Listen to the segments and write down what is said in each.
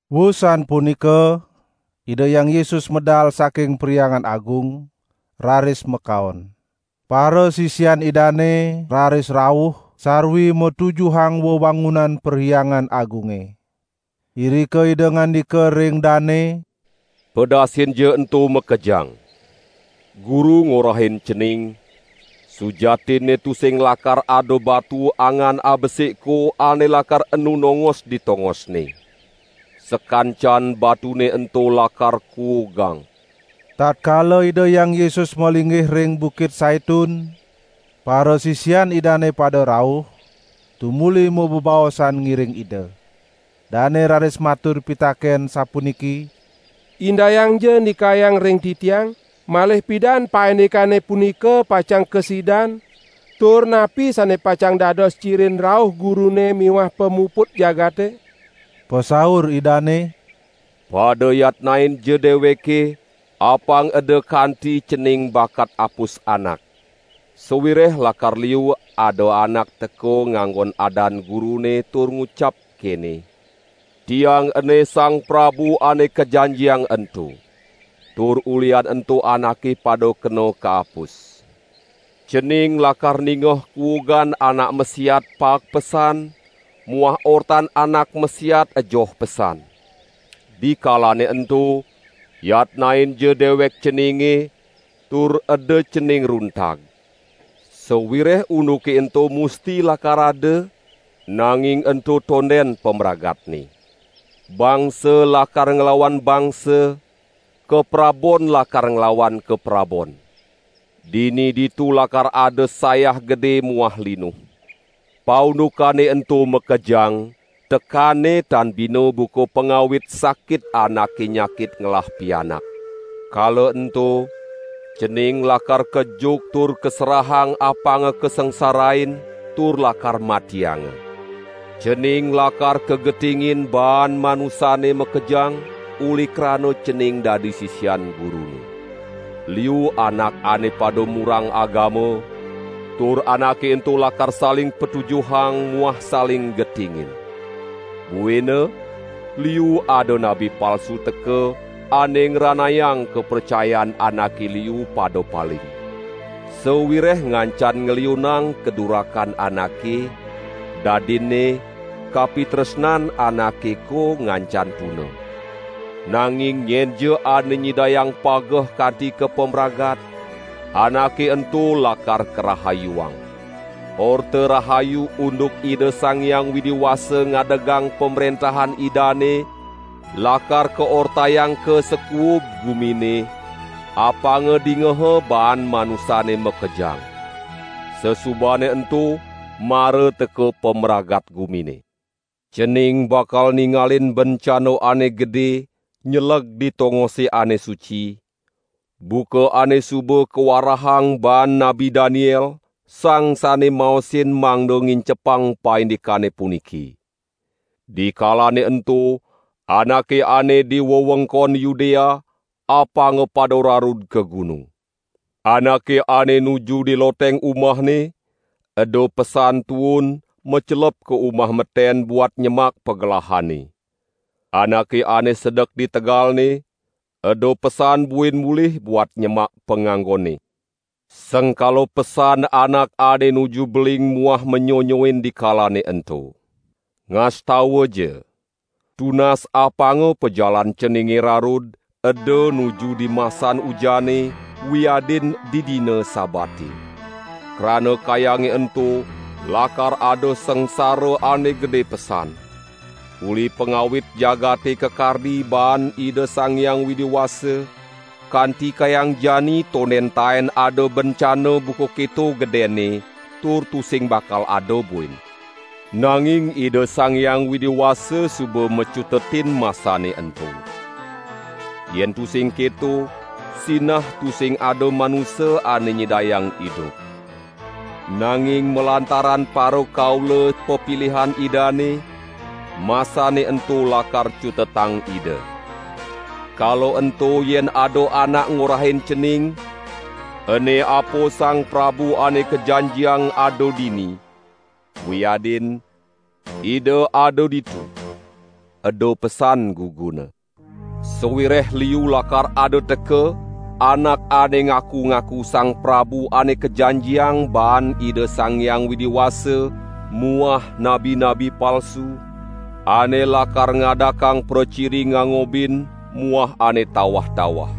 Wusan punika Ida Hyang Yesus medal saking Perhyangan Agung, raris makaon. Parasisian Idane raris rauh sarwi matujuhang wewangunan Perhyangan Agunge. Irika Ida ngandika ring dane: "Pedasinja ento makejang! Guru ngorahin cening, sujatinne tusing lakar ada batu angan abesikko ane lakar enu nongos di tongosne. Sakancan batune ento lakar kuugang." Tatkala Ida Hyang Yesus malinggih ring Bukit Saitun, parasisian Idane pada rauh, tumuli mabebaosan ngiring Ida. Dane raris matur pitaken sapuniki: "Indayangja ndikayang ring titiang, malih pidan paindikane punika pacang kasidan, tur napi sane pacang dados cirin rauh Gurune miwah pamuput jagate?" Pasaur Idane: "Pada yatnainja deweke apang eda kanti cening bakat apus anak. Sawireh lakar liu ada anak teka nganggon adan Gurune tur ngucap kene: 'Tiang ene Sang Prabu Ane Kajanjiang ento!' Tur ulihan ento anake pada kena kaapus. Cening lakar ningeh kuugan anak masiat paek pesan muah ortan anak masiat ejoh pesan. Dikalane ento, yatnainja dewek ceninge tur eda cening runtag. Sawireh unduke ento musti lakar ada, nanging ento tonden pamragatne. Bangsa lakar nglawan bangsa, kaprabon lakar nglawan kaprabon. Dini ditu lakar ada sayah gede muah linuh. Paundukane ento makejang tekanne tan bina buka pangawit sakit anake nyakit ngelah pianak. Kala ento cening lakar kejuk tur kaserahang apanga kasangsarain tur lakar matianga. Cening lakar kagetingin baan manusane makejang uli krana cening dadi sisian Gurune. Liu anak ane pada murang agama tur anake ento lakar saling patujuhang muah saling getingin. Buina liu ada nabi palsu teka ane ngranayang kapracayan anake liu pada paling. Sawireh ngancan ngliunang kadurakan anake, dadinne kapitresnan anakeko ngancan tuna. Nanging nyenja ane nyidayang pageh kanti ka pamragat, anake ento lakar karahayuang. Orta Rahayu unduk Ida Sang Hyang Widi Wasa ngadegang Pamrentahan Idane lakar kaortayang ka sakuub gumine, apanga dingaha baan manusane makejang. Sasubane ento mara teka pamragat gumine." "Cening bakal ningalin Bencana Ane Gede nyeleg di tongose ane suci, buka ane suba kawarahang baan Nabi Daniel (sang sane mamaosin mangda ngincepang paindikane puniki). Dikalane ento anake ane di wewengkon Yudea apanga pada rarud ka gunung. Anake ane nuju di loteng umahne eda pesan tuun macelep ka umah meten buat nyemak pagelahane. Anake ane sedek di tegalne eda pesan buin mulih buat nyemak panganggonne. Sengkala pesan anak ane nuju beling muah manyonyoin dikalane ento. Ngastawaja, tunas apanga pajalan ceninge rarud eda nuju dimasan ujane wiadin didina Sabate. Krana kayange ento lakar ada sangsara ane gede pesan. Uli pangawit jagate kakardi baan Ida Sang Hyang Widi Wasa, kanti kayang jani tonden taen ada bencana buka keto gedenne, tur tusing bakal ada buin. Nanging Ida Sang Hyang Widi Wasa suba macutetin masane ento. Yen tusing keto, sinah tusing ada manusa ane nyidayang idup. Nanging malantaran parakaula pepilihan Idane, masane ento lakar cutetang Ida. Kala ento yen ada anak ngorahin cening: 'Ene apa Sang Prabu Ane Kajanjiang ada dini!' wiadin 'Ida ada ditu!' eda pesan guguna. Sawireh liu lakar ada teka anak ane ngaku-ngaku Sang Prabu Ane Kajanjiang baan Ida Sang Hyang Widi Wasa muah nabi-nabi palsu, ane lakar ngadakang praciri ngangobin muah ane tawah-tawah.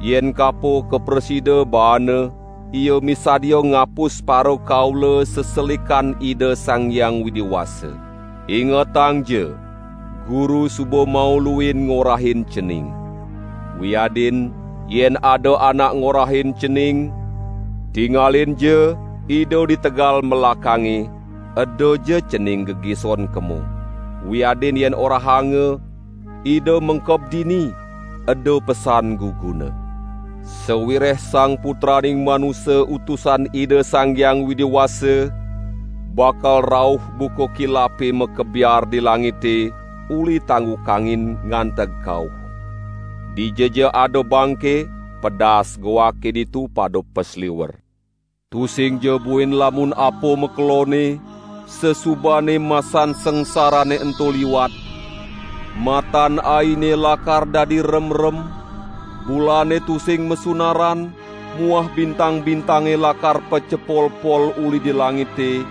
Yen kapo kaprasida baana ia misadia ngapus parakaula seselikan Ida Sang Hyang Widi Wasa. Ingetangja! Guru suba mauluin ngorahin cening. Wiadin, yen ada anak ngorahin cening: 'Tingalinja, Ida di tegal melakange,' edaja cening gegison kemo. Wiadin yen orahanga: 'Ida mengkeb dini,' eda pesan guguna. Sawireh Sang Putraning Manusa Utusan Ida Sang Hyang Widi Wasa bakal rauh buka kilape makebiar di langite uli tanggu kangin nganteg kauh. Dijaja ada bangke, pedas goake ditu pada pasliwer." "Tusingja buin lamun apa makelonne, sasubane masan sangsarane ento liwat, matan aine lakar dadi remrem, bulane tusing masunaran muah bintang-bintange lakar pacepolpol uli di langite,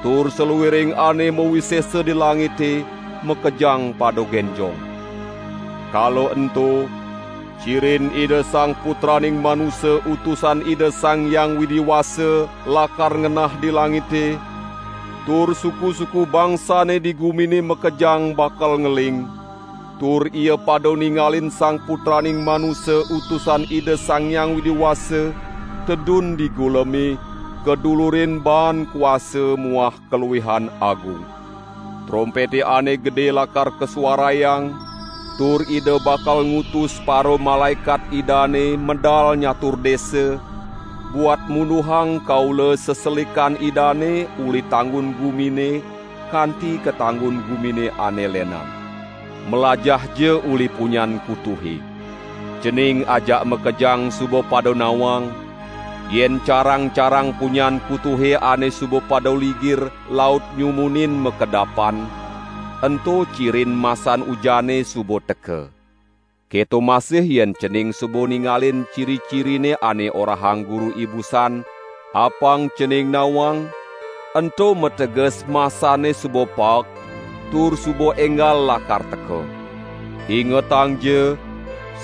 tur saluiring ane mawisesa di langite makejang pada genjong. Kala ento cirin Ida Sang Putraning Manusa Utusan Ida Sang Hyang Widi Wasa lakar ngenah di langite, tur suku-suku bangsane di gumine makejang bakal ngeling, tur ia pada ningalin Sang Putraning Manusa Utusan Ida Sang Hyang Widi Wasa tedun di guleme kadulurin baan kuasa muah kaluihan agung. Trompete ane gede lakar kasuarayang, tur Ida bakal ngutus paramalaekat Idane medal nyatur desa, buat munduhang kaula seselikan Idane uli tanggun gumine kanti ka tanggun gumine ane lenan." "Mlajahja uli punyan kutuhe! Cening ajak makejang suba pada nawang yen carang-carang punyan kutuhe ane suba pada ligir laut nyumunin makedapan, ento cirin masan ujane suba teka. Keto masih yen cening suba ningalin ciri-cirine ane orahang Guru ibusan, apang cening nawang, ento mateges masane suba paek, tur suba enggal lakar teka. Ingetangja,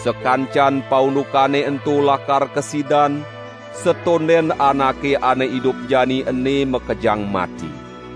sakancan paundukane ento lakar kasidan, satonden anake ane idup jani ene makejang mati.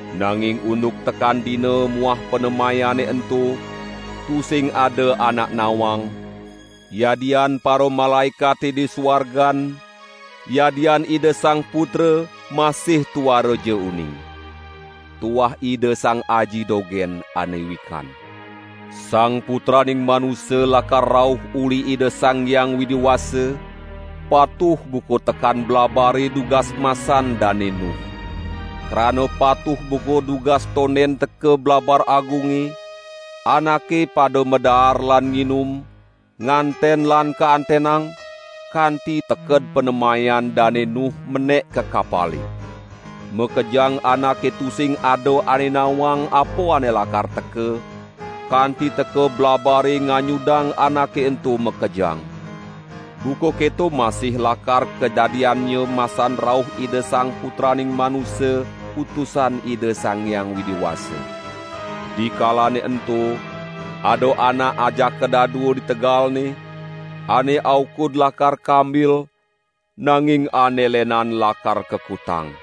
"Nanging unduk tekan dina muah panemayane ento, tusing ada anak nawang, yadian paramalaekate di suargan, yadian Ida Sang Putra, masih tuaraja uning. Tuah Ida Sang Aji dogen ane wikan. Sang Putraning Manusa lakar rauh uli Ida Sang Hyang Widi Wasa, patuh buka tekan blabare dugas masan Dane Nuh. Krana patuh buka dugas tonden teka blabar agunge, anake pada madaar lan nginum, nganten lan kaantenang, kanti teked panemayan Dane Nuh menek ka kapale. Makejang anake tusing ada ane nawang apa ane lakar teka, kanti teka blabare nganyudang anake ento makejang. Buka keto masih lakar kadadiannya masan rauh Ida Sang Putraning Manusa Utusan Ida Sang Hyang Widi Wasa. Dikalane ento, ada anak ajaka dadua di tegalne, ane aukud lakar kambil, nanging ane lenan lakar kakutang.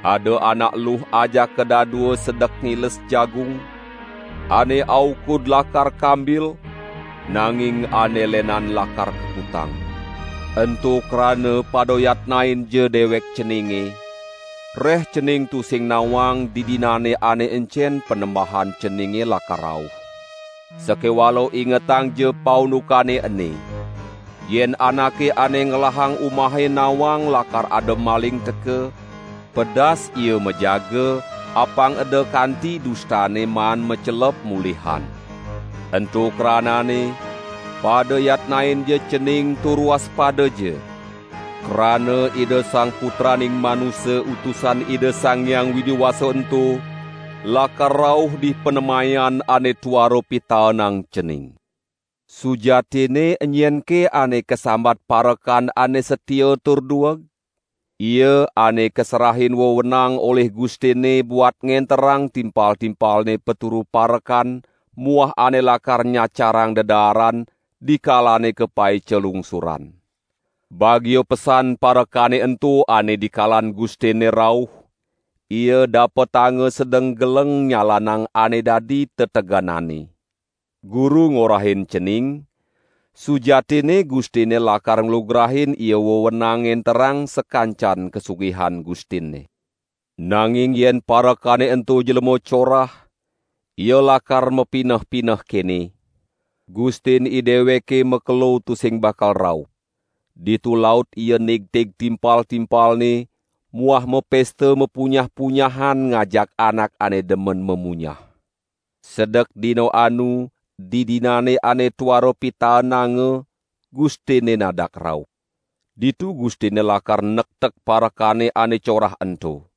Ada anak eluh ajaka dadua sedek ngiles jagung, ane aukud lakar kambil, nanging ane lenan lakar kakutang. Ento krana pada yatnainja dewek ceninge, reh cening tusing nawang didinane ane encen Panembahan ceninge lakar rauh. Sakewala ingetangja paundukane ene! Yen anake ane ngelahang umahe nawang lakar ada maling teka, pedas ia majaga apang eda kanti dustane maan macelep mulihan. Ento kranane, pada yatnainja cening tur waspadaja! Krana Ida Sang Putraning Manusa Utusan Ida Sang Hyang Widi Wasa ento lakar rauh dipanemayan ane tuara pitaenang cening." "Sujatinne enyenke ane kasambat parekan ane satia tur dueg? Ia ane kaserahin wewenang olih gustinne buat ngenterang timpal-timpalne paturu parekan muah ane lakar nyacarang dedaaran dikalane kapaica lungsuran. Bagia pesan parekane ento ane dikalan gustinne rauh, ia dapetanga sedeng geleng nyalanang ane dadi tetegenanne. Guru ngorahin cening: Sujatinne gustinne lakar nglugrain ia wewenang ngenterang sakancan kasugihan gustinne. Nanging yen parekane ento jlema corah, ia lakar mapineh-pineh kene: 'Gustin ideweke makelo tusing bakal rauh.' Ditu laut ia nigtig timpal-timpalne muah mapesta mapunyah-punyahan ngajak anak ane demen mamunyah. Sedek dina anu didinane ane tuara pitaenanga gustinne nadak rauh. Ditu gustinne lakar nektek parekane ane corah ento.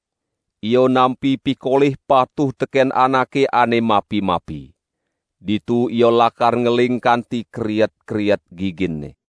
Ia nampi pikolih patuh teken anake ane mapi-mapi. Ditu ia lakar ngeling kanti kriet-kriet giginne."